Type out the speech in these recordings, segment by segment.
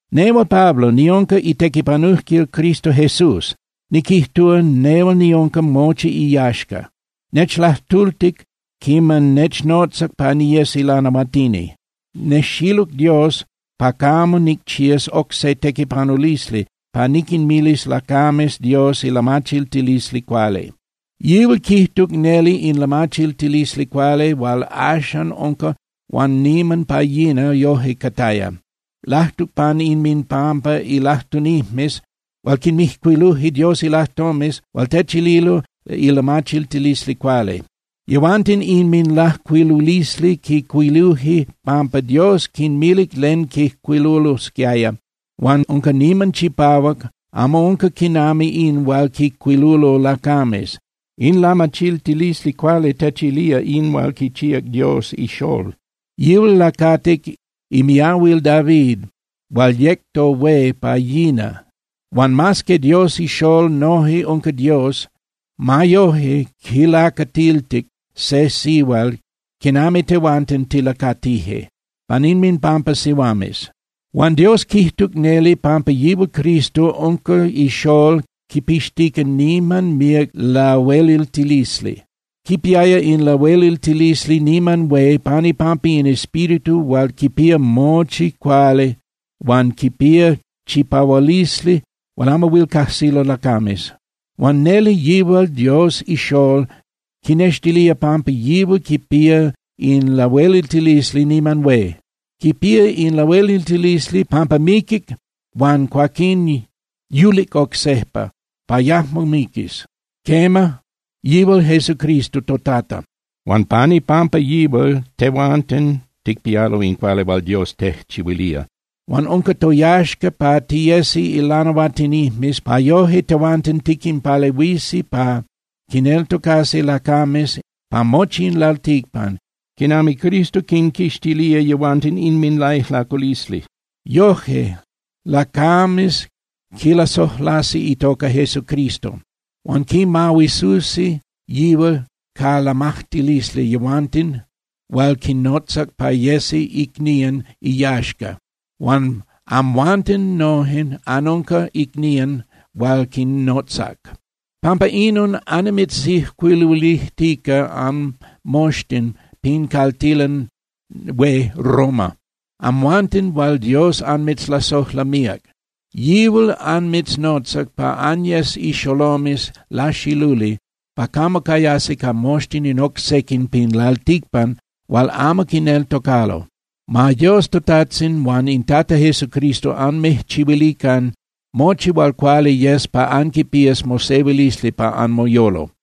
Nehual Pablo niunca itequipanujquil Cristo Jesús, niquijtúa, nehual niunca mochi iyaxca. Nechlajtultic quiman nechnotzac pa niyes ilanahuatini. Nejxiluc Dios pa camo nicchías oc se tequipanulisli pa niquinmilis lacames Dios ilamachiltilisli cuali. Yihual quijtuc neli in lamachiltilisli cuali hual axan unca huan niman pa yina yoje cataya. Lajtuc pan inminpampa ilajtunijmes hual quinmijcuiluje Dios ilajtomes hual techililo ilamachiltilisli cuali. Yehuanten inminlajcuilulisli quijcuiluje pampa Dios quinmilic len quijcuilulosquiaya huan unca niman chipahuac, amo unca quinami in hual quijcuilulo lacames. In lamachiltilisli cuali techilía in hual quichíac Dios iXolol. Yihual lacatic imiahuil David hual yec tohué pa yina. Huan mas que Dios iXolol noje unca Dios, ma yoje quilacatiltic se sihual quinami tehuanten tilacatije, pan inminpampa sihuames. Huan Dios quijtuc neli pampa yihual Cristo unca iXolol quipixtica niman míac lahueliltilisli. Quipiaya in lahueliltilisli niman hué pan ipampa in Espíritu hual quipía mochi cuali huan quipía chipahualisli hual amo huil cajsilo lacames. Huan neli yihual Dios iXolol quinextilía pampa yihual quipía in lahueliltilisli niman hué. Quipía in lahueliltilisli pampa miquic huan cuaquín yulic oc sejpa pa yajmo miquis, quema, yihual Jesucristo toTata. Huan pan ipampa yihual tehuanten ticpialo in cuali hual Dios tejchihuilía. Huan unca toyaxca pa tiyesi ilanahuatinijmes pa yoje tehuanten tiquinpalehuisi pa quineltocasi lacames pa mochi in lalticpan quinami Cristo quinquixtilía yehuanten inminlaijlaculisli. Yoje, lacames quilasojlasi itoca Jesucristo. Huan quimahuisusi yihual ca lamajtilisli yehuanten hual quinnotzac pa yesi icnían iyaxca. Huan amhuanten noje anunca icnían hual quinnotzac. Pampa inon annimitzijcuiluilijtica anmoxtin pin caltilan hué Roma, amhuanten hual Dios anmitzlasojla míac. Yihual anmitznotzac pa anyes ixolomes laxiluli pa camo cayasi ca moxtin in oc sequin pin lalticpan hual amo quineltocalo. Ma Dios toTajtzin huan in Tata Jesucristo anmijchihuilican mochi hual cuali yes pa anquipías mosehuilisli pa anmoyolo.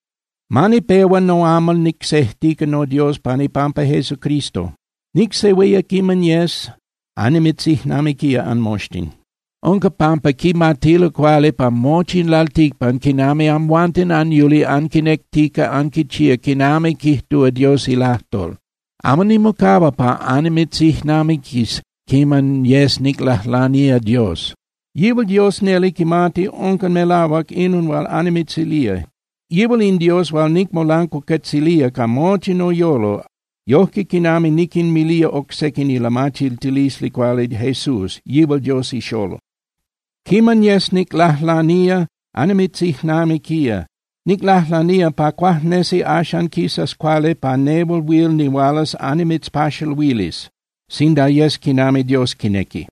Ma nipehua noamal nicsejtica noDios pan ipampa Jesucristo. Nicsehuía quiman yes annimitzijnamiquía anmoxtin. Unca pampa quimatilo cuali pa mochi in lalticpan quinami amhuanten anyuli anquinectica anquichía quinami quijtúa Dios ilajtol. Amo nimocahua pa annimitzijnamiquis quiman yes niclajlanía Dios. Yihual Dios neli quimati unca melahuac inon hual annimitzilía. Yihual in Dios hual nicmolancuacuetzilía ca mochi noyolo yojque quinami niquinmilía oc sequin ilamachiltilisli cuali Jesús, yihual Dios iXolol. Quiman yes niclajlanía, annimitzijnamiquía. Niclajlanía pa cuajnesi axan quisas cuali pa nehual huil nihualas annimitzpaxaluilis, sinda yes quinami Dios quinequi.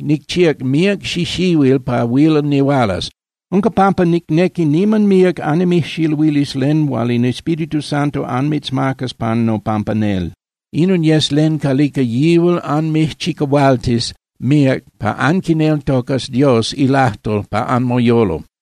Nicchíac míac xixihuil pa huil nihualas. Unca pampa nicnequi niman míac annimijxiluilis len hual in Espíritu Santo anmitzmacas pan nopampa nel. Inon yes len calica yihual anmijchicahualtis míac pa anquineltocas Dios ilajtol pa anmoyolo.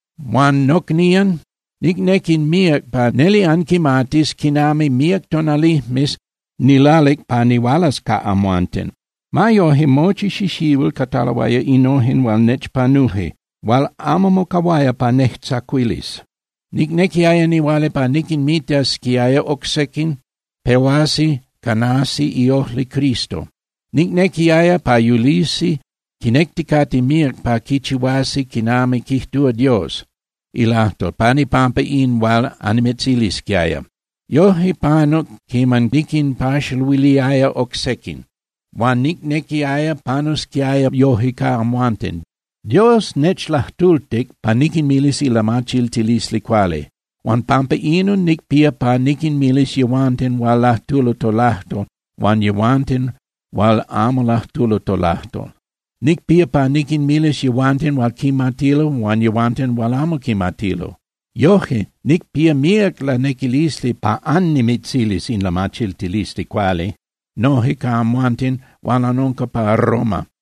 Huan nocnían, nicnequi míac pa neli anquimatis quinami míac tonalijmes niclalic pa nihualas ca amhuanten. Ma yoje, mochi xixihuil cataloaya innojen hual nechpanuje hual amo mocahuaya pa nejtzacuilis. Nicnequiaya nihuala pa niquinmitasquiaya oc sequin pehuasi canasi iojli Cristo. Nicnequiaya pa yulisi quinecticate míac pa quichihuasi quinami quijtúa Dios ilajtol pan ipampa in hual annimitzilisquiaya. Yoje panuc quiman niquinpaxaluiliaya oc sequin, huan nicnequiaya pa panusquiaya yoje ca amhuanten. Dios nechlajtultic pa niquinmilis ilamachiltilisli cuali. Huan pampa inon nicpía pa niquinmilis yehuanten hual lajtulo tolajtol huan yehuanten hual amo lajtulo tolajtol, nicpía pa niquinmilis yehuanten hual quimatilo huan yehuanten hual amo quimatilo. Yoje, nicpía míac lanequilisli pa annimitzilis in lamachiltilisli cuali noje ca amhuanten hual anunca pa Roma.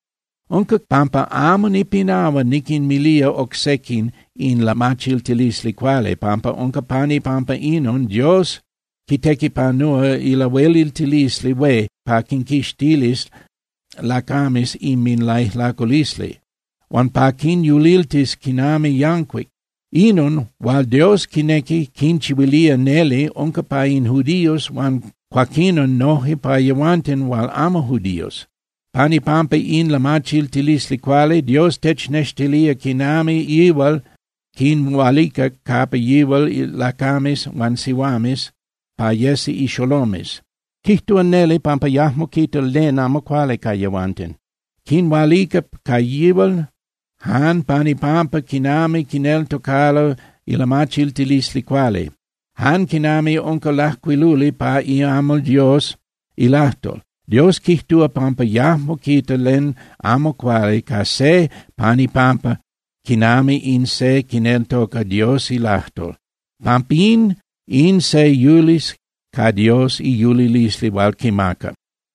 Unca pampa amo nipinahua niquinmilía oc sequin in lamachiltilisli cuali, pampa unca pan ipampa inon Dios quitequipanúa ilahueliltilisli hué pa quinquixtilis lacames inminlaijlaculisli, huan pa quinyuliltis quinami yancuic. Inon hual Dios quinequi quinchihuilía neli unca pa in judíos huan cuaquinon noje pa yehuanten hual amo judíos. Pan ipampa in lamachiltilisli cuali, Dios technextilía quinami yihual quinhualica capa yihual lacames huan sihuames pa yesi ixolomes, quijtúa neli pampa yajmo quita len amo cuali ca yehuanten. Quinhualica ca yihual jan pan ipampa quinami quineltocalo ilamachiltilisli cuali, jan quinami unca lajcuiluli pa iamal Dios ilajtol: “Dios quijtúa pampa yajmo quita len amo cuali ca se pan ipampa quinami in se quineltoca Dios ilajtol. Pampín in se yulis ca Dios iyulilisli hual quimaca.”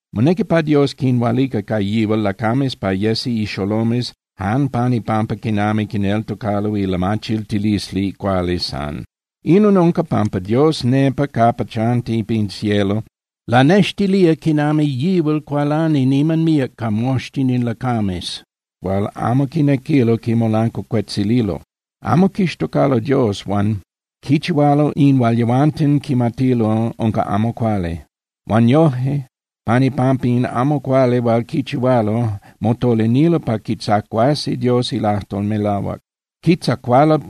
Monequi pa Dios quinhualica ca yihual lacames pa yesi ixolomes jan pan ipampa quinami quineltocalo ilamachiltilisli cuali san. Inon unca pampa Dios, nepa capa chanti pin cielo, lanextilía quinami yihual cualani niman míac ca moxtin in lacames hual amo quinequilo quimolancuacuetzililo. Amo quixtocalo Dios huan quichihualo in hual yehuanten quimatilo unca amo cuali. Huan yoje pan ipampa in amo cuali hual quichihualo, motolinilo pa quitzacuasi Dios ilajtol melahuac. Quitzacualo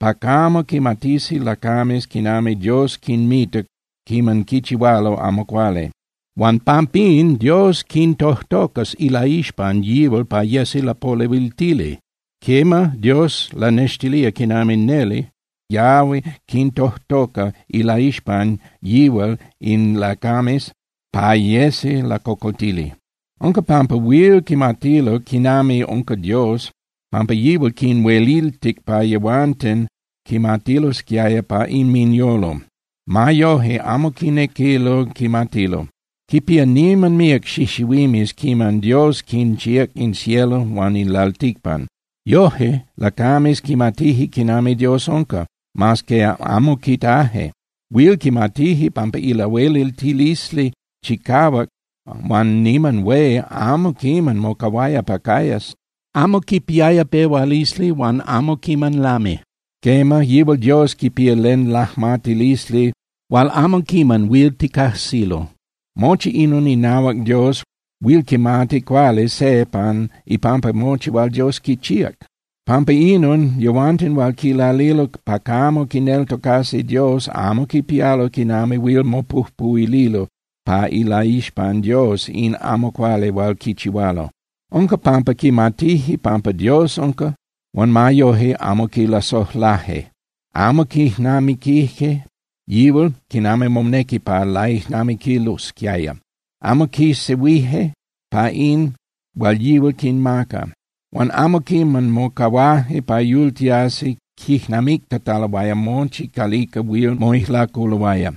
pa camo quimatisi lacames quinami Dios quinmita quiman quichihualo amo cuali. Huan pampín, Dios quintojtocas ilaixpan yihual pa yesi lapolehuiltili. Quema, Dios lanextilía quinami neli yahui quintojtoca ilaixpan yihual in lacames pa yesi lacocoltili. Unca pampa huil quimatilo quinami unca Dios, pampa yihual quinhueliltic pa yehuanten quimatilosquiaya pa inminyolo. Ma yoje, amo quinequilo quimatilo. Quipía niman míac xixihuimes quiman Dios quinchíac in cielo huan in lalticpan. Yoje, lacames quimatije quinami Dios unca, mas que amo quitaje. Huil quimatije pampa ilahueliltilisli chicahuac huan niman hué amo quiman mocahuaya pa cayas. Amo quipiaya pehualisli huan amo quiman lami. Quema, yihual Dios quipía len lajmatilisli hual amo quiman huil ticajsilo. Mochi inon inahuac Dios huil quimati cuali se pan ipampa mochi hual Dios quichíac. Pampa inon, yehuanten hual quilalilo pa camo quineltocasi Dios amo quipialo quinami huil mopujpuhuililo pa ilaixpan Dios in amo cuali hual quichihualo. Unca pampa quimatije pampa Dios unca, huan ma yoje amo quilasojlaje. Amo quijnamiquije yihual quinami monequi pa laijnamiquilosquiaya. Amo quisehuije pa in hual yihual quinmaca. Huan amo quiman mocahuaje pa yultiasi quijnamictataloaya mochi calica huil moijlaculoaya.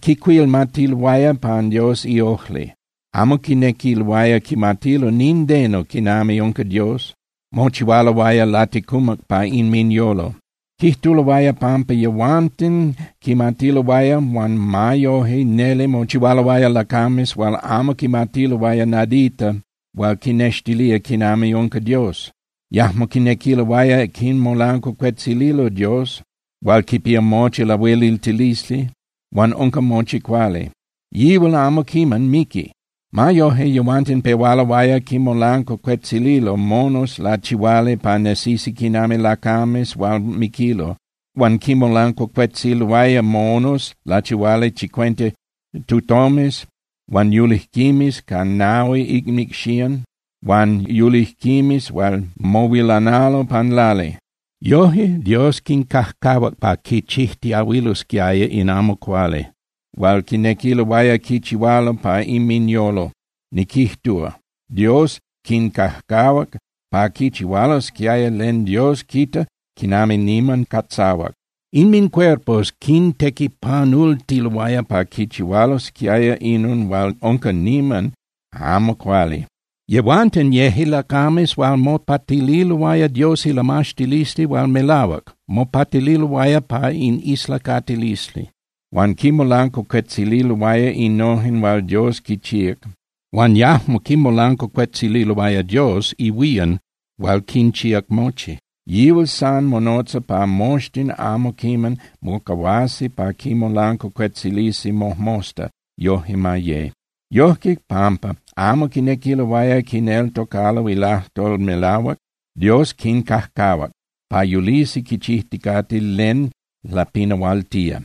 Quicuilmatiloaya pan Dios iojli, amo quinequiloaya quimatilo nindeno quinami unca Dios, mochihualoaya laticumac pa inminyolo. Quijtuloaya pampa yehuanten quimatiloaya, huan ma yoje neli mochihualoaya lacames hual amo quimatiloaya nadita hual quinnextilía quinami unca Dios. Yajmo quinequiloaya quimolancuacuetzililo Dios hual quipía mochi lahueliltilisli huan unca mochi cuali, yihual amo quiman miqui. Ma yoje, yehuanten pehualoaya quinmolancuacuetzililo monos lachihuali pa nesisi quinami lacames hual miquilo. Huan quinmolancuacuetzililoaya monos lachihuali chicuenta tutomes huan yulijquimes ca nahui inmicxían huan yulijquimes hual mohuilanalo pan lali. Yoje, Dios quincajcahuac pa quichijtiahuilosquiaya in amo cuali hual quinequiloaya quichihualo pa inminyolo, niquijtúa, Dios quincajcahuac pa quichihualosquiaya len Dios quita quinami niman catzahuac. Inmincuerpos quintequipanultiloaya pa quichihualosquiaya inon hual unca niman amo cuali. Yehuanten yeje lacames hual mopatililoaya Dios ilamaxtilisli hual melahuac, mopatililoaya pa in islacatilisli, huan quinmolancuacuetzililoaya innojen hual Dios quichíac huan yajmo quimolancuacuetzililoaya Dios ihuían hual quinchíac mochi. Yihual san monotza pa moxtin amo quiman mocahuasi pa quimolancuacuetzilisi mojmosta, yoje ma ye. Yojque, pampa amo quinequiloaya quineltocalo ilajtol melahuac, Dios quincajcahuac pa yulisi quichijticate len lapinahualtía.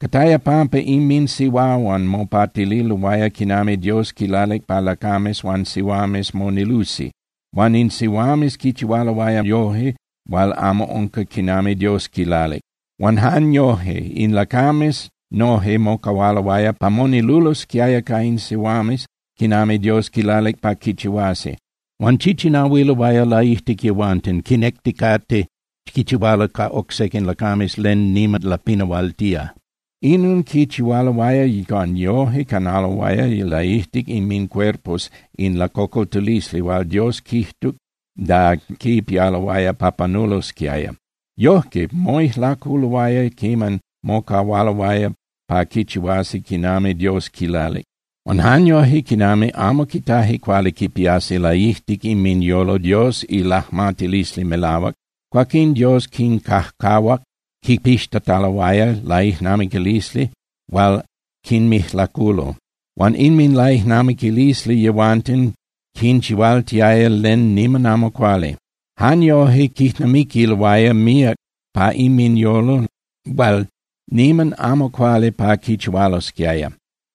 Cataya pampa inminsihuahuan mopatililoaya quinami Dios quilalic pa lacames huan sihuames monilusi huan in sihuames quichihualoaya yoje hual amo unca quinami Dios quilalic. Huan jan yoje, in lacames noje mocahualoaya pa monilulosquiaya ca in sihuames quinami Dios quilalic pa quichihuasi, huan chichinahuiloaya laijtic yehuanten, quinecticate quichihualo ca oc sequin lacames len niman lapinahualtía. Inon quichihualoaya huan yoje canaloaya laijtic inmincuerpos in lacocoltilisli hual Dios quijtuc da quipialoaya pa panulosquiaya. Yojque, moijlaculoaya quiman mocahualoaya pa quichihuasi quinami Dios quilalic. Huan jan yoje, quinami amo quitaje cuali quipiasi laijtic inminyolo Dios ilajmatilisli melahuac, cuaquín Dios quincajcahuac quipixtataloaya laijnamiquilisli hual quinmijlaculo, huan inminlaijnamiquilisli yehuanten quinchihualtiaya len niman amo cuali. Jan yoje quijnamiquiloaya míac pa inminyolo hual niman amo cuali pa quichihualosquiaya.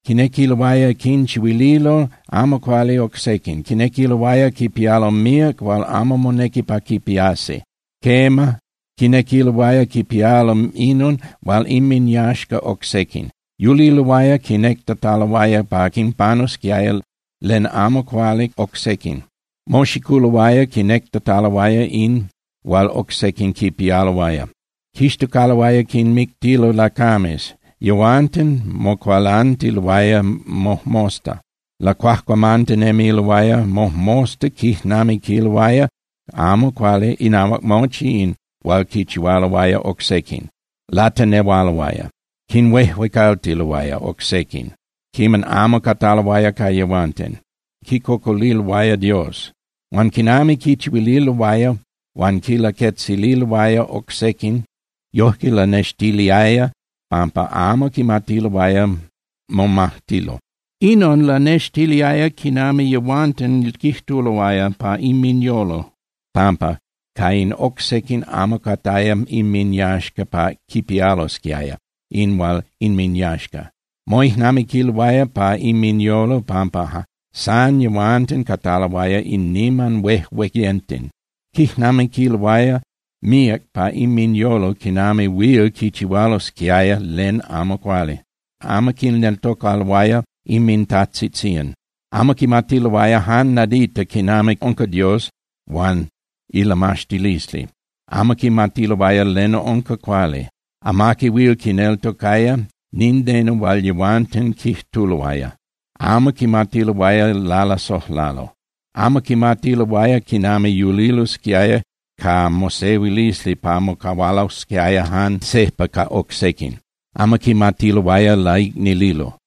Quinequiloaya quinchihuililo amo cuali oc sequin, quinequiloaya quipialo míac hual amo monequi pa quipiasi. Quema, quinequiloaya quipialo inon hual inminyaxca oc sequin. Yuliloaya quinectataloaya pa quinpanusquiaya len amo cuali oc sequin, moxiculoaya quinectataloaya in hual oc sequin quipialoaya, quixtocaloaya quinmictilo lacames, yehuanten mocualantiloaya mojmosta lacuajcuamantinemiloaya, mojmosta quijnamiquiloaya amo cuali inahuac mochi in hual quichihualoaya oc sequin, latenehualoaya. Quinhuejuecaltiloaya oc sequin quiman amo cataloaya ca yehuanten, quicocoliloaya Dios. Huan quinami quinchihuililoaya huan quinlaquetzililoaya oc sequin, yojque lanextiliaya pampa amo quimatiloaya momajtilo. Inon lanextiliaya quinami yehuanten quijtuloaya pa inminyolo pampa ca in oc sequin amo cataya inminyaxca pa quipialosquiaya in hual inminyaxca. Moijnamiquiloaya pa inminyolo pampa san yehuanten cataloaya in niman huejueyenten. Quijnamiquiloaya míac pa inminyolo quinami huil quichihualosquiaya len amo cuali. Amo quineltocaloaya inmintajtzitzían. Amo quimatiloaya jan nadita quinami unca Dios huan ilamaxtilisli, amo quimatiloaya len unca cuali. Amaqui huil quineltocaya nindeno hual yehuanten quijtuloaya, amo quimatiloaya lalasojlalo. Amo quimatiloaya quinami yulilosquiaya ca mosehuilisli pa mocahualosquiaya jan sejpa ca oc sequin, amo quimatiloaya laicnililo.